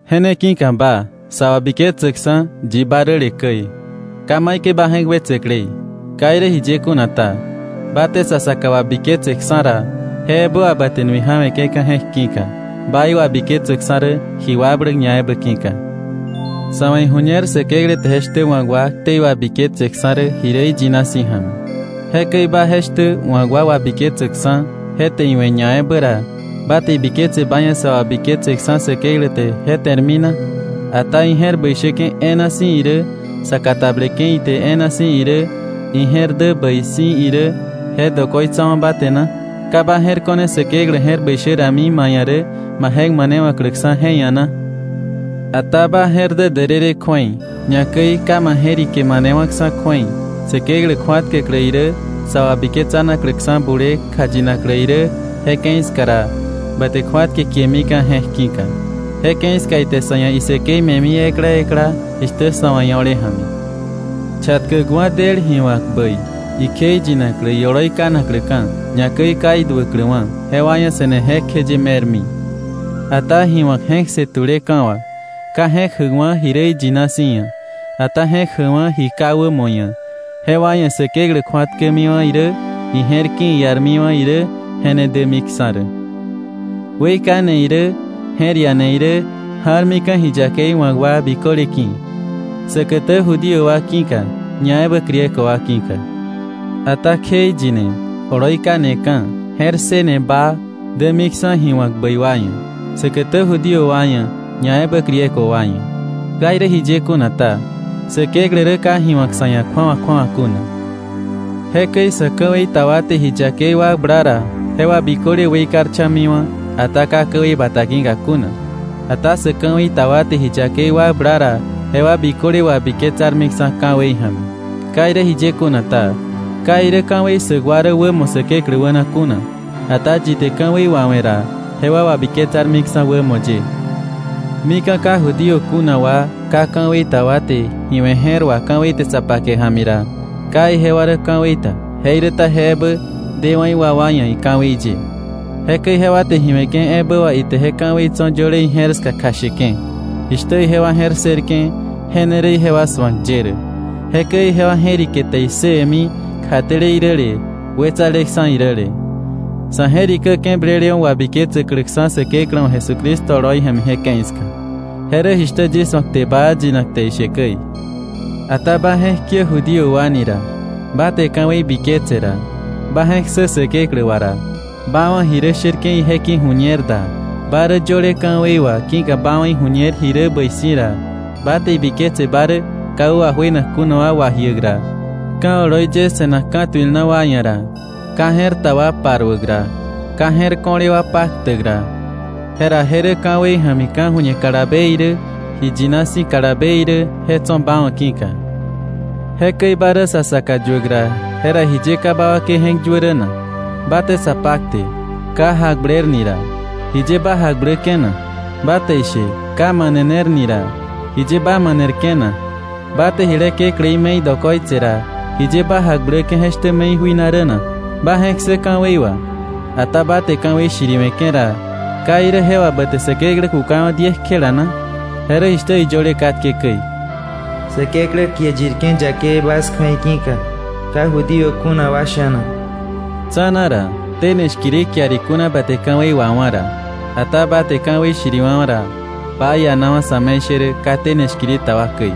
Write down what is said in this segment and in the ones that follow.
Je ne ki̱ka ba, sa wabiketsäkksa̱ yi ba räle käi, ka maikäi ba je̱k wetsäklei. Ka irä jiye kuna ta, ba te sa saka wabiketseksa̱ ra, je ebä wà ba te nui ja̱we̱ke̱ka̱ je̱k ki̱ka, ba iwabiketsäkksa̱ rä ji wakbläk ñaebä ki̱ka. Sa̱ wa̱ iju̱ñer Säkeklä rä je shtä wa̱k wa ktei wabiketsäkksa̱ rä ji rä iyina si̱ ja̱mi. Jekäi ba je shtä wa̱k wa wabiketsäkksa̱ je te iwe̱ ñaebä ra, ¿ba te ibiketse ba ia̱ sa wabiketseksa̱ Säkeklä te je te̱rmi na? ¿Ata ije̱r bäi shäke̱ e̱e̱na si̱ irä, sa katableke̱ ite e̱e̱na si̱ irä, ije̱r dä bäi si̱ irä, je dokoitsawa̱ ba te na? ¿Ka ba je̱r ko̱ne Säkeklä je̱r bäi shä rami ma ia̱ rä ba je̱k manewa̱kläksa̱ je ia̱ na? Ata ba je̱r dä därërë kju̱ei, ñakäi ka ma je̱rike manewa̱ksa̱ kju̱ei, Säkeklä kju̱atkäklä irä, sa wabiketsanakläksa̱ bulee kjayinaklä irä, je ke̱i ska ra, ba te kju̱atke kiemika̱ je̱k ki̱ka. Je ke̱i ska ite sa̱ ia̱ isäkei me̱mi ekla ekla jishtä sa̱ wa̱ io̱le ja̱mi. Chatkäkwa̱ del ji wa̱k bäi, ikjeiyinaklä ioloi kanakläka̱, ñakäi ka iduäkläwa̱, jewa ia̱ se̱ne jekjeye me̱rmi. Ata ji wa̱k je̱k ssë tu̱leka̱ wà, ka je̱k jäkwa̱ ji rä iyina si̱ ia̱, ata je̱k jäkwa̱ ji ka wämo ia̱, jewa ia̱ Säkeklä kju̱atkämiwa̱ irä, ije̱r ki̱ iarmiwa̱ irä, je ne dämiksa̱ rä. Weikane irä je̱r iane irä, ja̱rmika̱ ji yakei wa̱k wa biköle ki̱, säkätä Judío wa ki̱ka, ñaebä Griego wa ki̱ka. Ata kjeiyine, oloi kaneka̱, je̱r ssëne baa, dämiksa̱ ji wa̱k bäi wa ia̱, säkätä Judío wa ia̱, ñaebä Griego wa ia̱. Ka irä jiye kuna ta, Säkeklä rä ka ji wa̱k sa̱ ia̱ kju̱awa kju̱awa kuna. Jekäi sä ka ka̱wei ta wa te ji yakei wakbla ra, jewa biköle weikarcha̱miwa̱, ata ka ka̱wei bata ki̱ka kuna. Ata sä ka̱wei ta wa te ji yakei wakbla ra, jewa biköle wabiketsarmiksa̱ ka̱wei ja̱mi. Ka irä jiye kuna ta, ka irä ka̱wei ssäk wa rä wämo Säkeklä wäna kuna, ata yi te ka̱wei wawe̱ ra, jewa wabiketsarmiksa̱ wämo ye. Mika̱ ka Judío kuna wa ka ka̱wei ta wa te ji we̱ je̱r wà ka̱wei te sa pake ja̱mi ra, ka ijewa rä ka̱wei ta, jeiräta je ebä dewa̱ iwakwa ia̱ ika̱wei ye. Jekäi jewa te ji we̱ke̱ ebä wà ite je ka̱wei tso̱ yöle ije̱r ska kjasheke̱. Jishtä ijewa je̱r ssërke̱ je ne rä ijewa su̱ak ye rä. Jekäi ijewa je̱rike te issëwe̱mi kjatele iräle wetsaleksa̱ iräle, sa̱ je̱rikäke̱ blelewa̱ wabiketsäkläksa̱ Säkeklä wa̱ Jesucristo oloi ja̱mi je ke̱i ska. Je rä jishtä yis wa̱ kte baa yinak te ishe käi. Ata ba je̱k kiä Judío wa ni ra, ba te ka̱wei biketse ra, ba je̱k ssä Säkeklä wà ra, ba wa̱ ji rä sherke̱ ije ki̱ ju̱ñer da, ba rä yöle ka̱wei wà ki̱ka ba wa̱ iju̱ñer jibä rä bäi si̱ ra, ba te ibiketse ba rä ka wä wajuenak kuna wa wajiäk ra, ka̱ oloi ye se̱nak ka̱tuil na wa ia̱ ra, ka je̱r ta wa paruäk ra, ka je̱r ko̱le wa paktäk ra, jera je rä ka̱wei ja̱mi ka̱ju̱ñe kalabe irä ji yina si̱ kalabe irä je tso̱ ba wa̱ ki̱ka, jekäi ba rä sa saka yuäk ra, jera ¿jiye ka ba wakei je̱k yuä rä na? Ba te sa pakte, ka jakbler ni ra, ¿jiye ba jakbläke̱ na? Ba te ishe, ka manener ni ra, ¿jiye ba manerke̱ na? Ba te jile kekläí me̱i dokoitse ra, ¿jiye ba jakbläke̱ je shtä me̱i jui na rä na? Ba je̱k ssä ka̱wei wà. Ata ba te ka̱wei shiriwe̱ke̱ ra, ¿ka irä je wà ba te Säkeklä kukawa̱ diekjela na? Je rä jishtä iyöle katke käi: “Säkeklä kie yirke̱ yakei bas kju̱ei ki̱ka, ka Judío kuna wa sha̱na.” Tsa̱na ra, tene shkiri kiar ikuna ba te ka̱wei wawá̱ ra. Ata ba te ka̱wei shiriwa̱wa̱ ra, ba ianawa̱ sa̱me̱ishärä ka tene shkiri ta wa käi.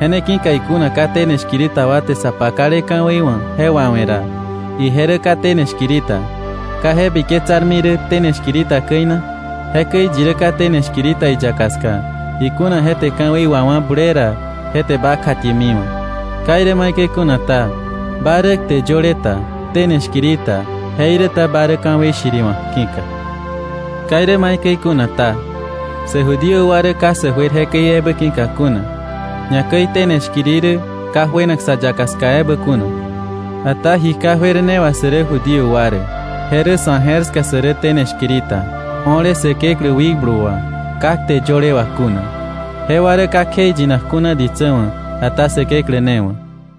Je ne ki̱ka ikuna ka tene shkiri ta wa te sa pakale ka̱wei wa̱ je wawe̱ ra, ije rä ka tene shkiri ta, ¿ka je biketsarmi rä tene shkiri ta käi na? Jekäi yi rä ka tene shkiri ta iyaka ska, ikuna je te ka̱wei wawá̱ bulee ra, je te ba kjatiemiwa̱. Ka irä maikäi kuna ta, ba rä kte yöle ta, tene shkiri ta jeiräta ba rä ka̱wei shiriwa̱k ki̱ka. Ka irä maikäi kuna ta, sä Judío wa rä ka sä juer jekäi ebä ki̱ka kuna, ñakäi tene shkiri rä ka juenak sa yaka ska ebä kuna. Ata ji ka juer ne wà sä rä Judío wa rä. Je rä sa̱ je̱r ska sä rä tene shkiri ta, o̱le Säkeklä wikblu wà ka kte yöle wà kuna. Jewa rä ka kjeiyinak kuna ditsä wa̱, ata Säkeklä ne wa̱.